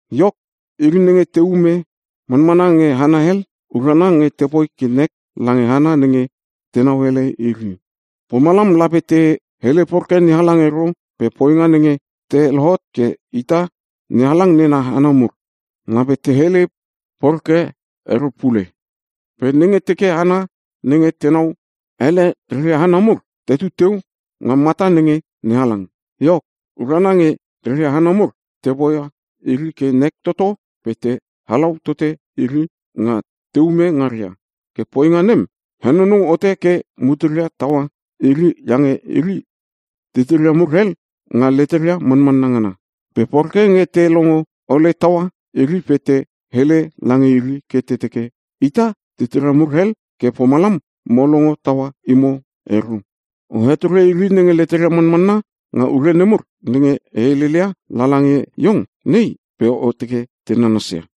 Iok, iri nenge teume manmana nge hana hel, urana nge tepoi ke nek lange hana nenge tenau ele iri. Pomalam lape te hele poreke NeHalang ero pe poinga nenge ta lohot ke ita NeHalang nena hana mur, lape te hele poreke ero pule. Pe nenge teke hana nenge tenau ele reria hana mur tetu teu nga mata nenge NeHalang, iok, urana nge reria hana mur te poia iri ke nek toto pe te halau tote iri nga teume ngaria. Ke poinga nem henonou hote ke muteria taua iri iange iri titiria mur hel nga leteria manmanna ngana. Pe poreke nge te longo ole taua iri pe te hele lange iri ke te teke, “Ita titira mur hel ke pomalam mo longo taua imo ero.” O hetore iri nenge leteria manmanna nga ure nemur nenge e heleleia lala nge iong nei pe o teke te nanasia.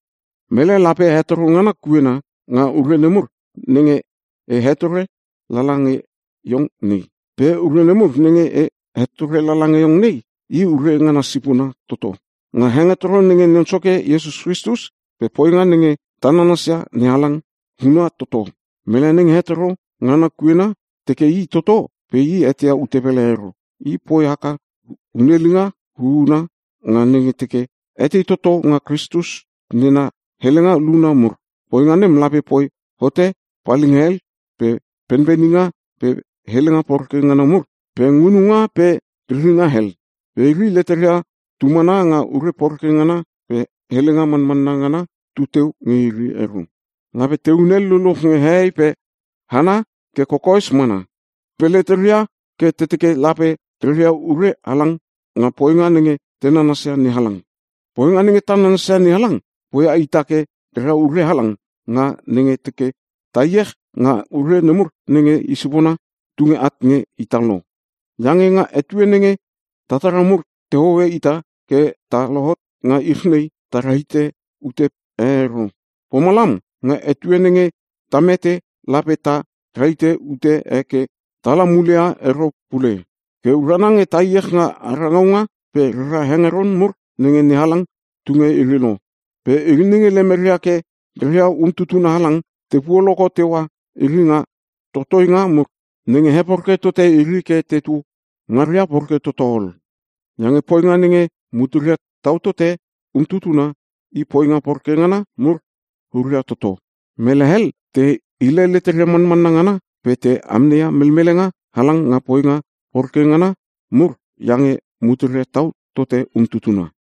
Mele lape hetoro ngana kuena nga ure nemur nenge e hetore lala nge iong nei. Pe ure nemur nenge e hetore lala nge iong nei i ure ngana sipona toto, nga hengetoro nenge Non Soke Iesus Kristus pe poinga nenge ta nanasia NeHalang, huna toto. Mele nenge hetoro ngana kuena teke i toto pe i eteia ute pele ero. I poi haka hunelinga huuna nga nenge teke etei toto nga Kristus nena helenga luna mur. Poinga nem lape poi hote palhelinga pe penpeninga pe helenga poreke ngana mur pe ngununga pe riringa hel. Pe iri, leteria tumana nga ure poreke ngana pe helenga manmanna ngana tuteu nge iri ero, lape tehun hel luluch nge hehei pe hana ke kokoes mana. Pe leteria ke teke lape reria ure halang nga poinga nenge te nanasia NeHalang. Poinga nenge ta nanasia NeHalang poia ita ke rera ure halang nga nenge teke ta iech nga ure nemur nenge i sipona tunge at nge ita lo. Iange nga etue nenge tatara mur tehoe ita ke ta lohot nga ich nei, ta rahite ute e ero. Pomalam nga etue nenge ta mete lape ta rahite ute e ke tala muleia ero pule. Ke urana nge ta iech nga ara ngaunga pe rera hengeron mur nenge NeHalang tunge iri lo. Pe iri nenge lemeria ke reria umtutuna halang te puoloko teua iri nga totoinga mur nenge heporeke tote iri ke tetu ngaria poreke toto ol. Iange poinga nenge mutera tau tote umtutuna, i poinga poreke ngana mur huria toto. Mele hel te hile leteria manmanna ngana pe te amneia melmelenga halang nga poinga poreke ngana mur iange muteria tau tote umtutuna.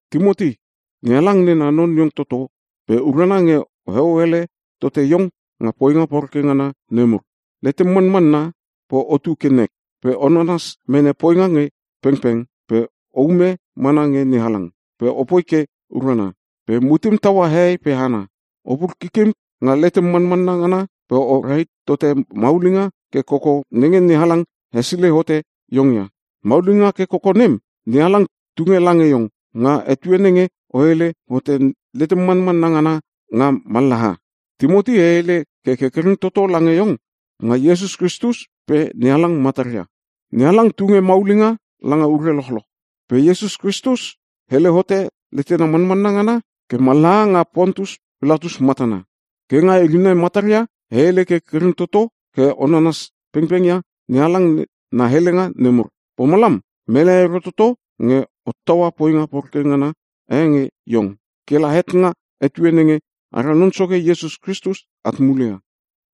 Timoti, NeHalang nena non iong toto pe urana nge oheo ele tote iong nga poinga poreke ngana nemur. Letem manmanna, pe otu ke nek, pe o nanas mene poinga nge pengpeng, pe oume mana nge NeHalang, pe opoi ke urana, pe mutem taua hehei pe hana. Opur kikim nga letem manmanna ngana pe o rahit tote maulinga ke koko nenge NeHalang hesilei hote iong ia. Maulinga ke koko nem NeHalang tunge lange iong, nga etue nenge o hele hote letem manmanna ngana nga mallaha. Timoti, e hele ke kerkereng toto lange iong nga Iesus Kristus pe NeHalang mataria. NeHalang tunge maulinga langa ure lochloch. Pe Iesus Kristus hele hote letena manmanna ngana ke mallaha nga Pontus Pilatus matana. Ke nga iri nai mataria e hele ke kerkereng toto ke o nanas pengpeng ia NeHalang na helenga nemur. Pomalam mele ero toto nge hottaua poinga poreke ngana e nge iong, ke la het nga etue nenge ara Non Soke Iesus Kristus at muleia.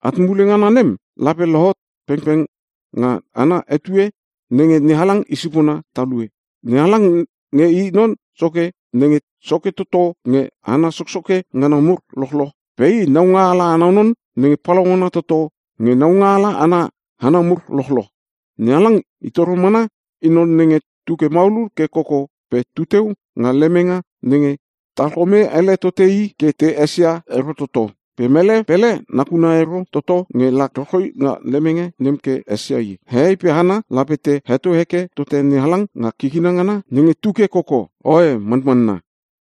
At mule ngana nem lape lohot pengpeng nga ana etue nenge NeHalang i sipona talue. NeHalang nge i Non Soke nenge soke toto nge hana soksoke ngana mur lochloch pe i Naungaala ana non nenge palaungana toto nge naungaala ana hana mur lochloch. NeHalang i toro mana i non nenge tuke maulul ke koko pe tuteu nga lemenga nenge talkome ele tote i ke te esia ero toto. Pe mele pele nakuna ero toto nge la rochroi nga lemenga nem ke esia i. Hehei pe hana lape te heto heke tote NeHalang nga kikina ngana nenge tuke koko. Oe, Manmanna.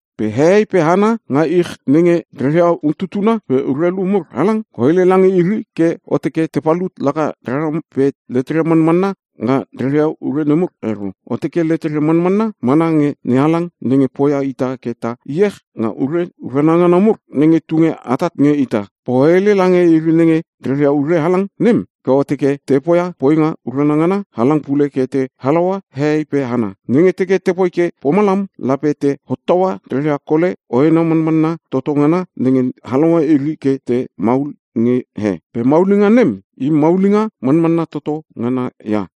Pe hehei pe hana nga ich nenge reria umtutuna pe urelu mur halang, o hele lange iri ke o teke te palut laka rara pe leteria manmanna nga reria ure nemur ero. O teke leteria manmanna mana nge NeHalang nenge poia ita ke ta iech nga ure urana ngana mur nenge tunge atat nge ita. Pe o hele lange iri nenge reria ure halang nem ke o teke te poia poinga urana ngana halang pule ke te halaua hehei pe hana. Nenge teke tepoi ke pomalam lape te hottaua reria kole hoena manmanna toto ngana nenge halaua iri ke te maul nge he. Pe maulinga nem i maulinga manmanna toto ngana ia.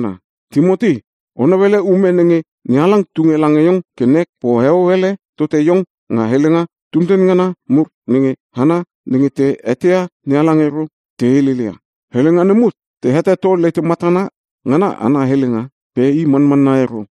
Timoti, o nauele ume nenge NeHalang tunge lange iong ke nek pe oheo ele tote iong nga helenga tunten ngana mur nenge hana nenge te eteia NeHalang ero te heleleia. Helenga nemur te heteto “letematana ngana ana helenga” pe i manmanna ero.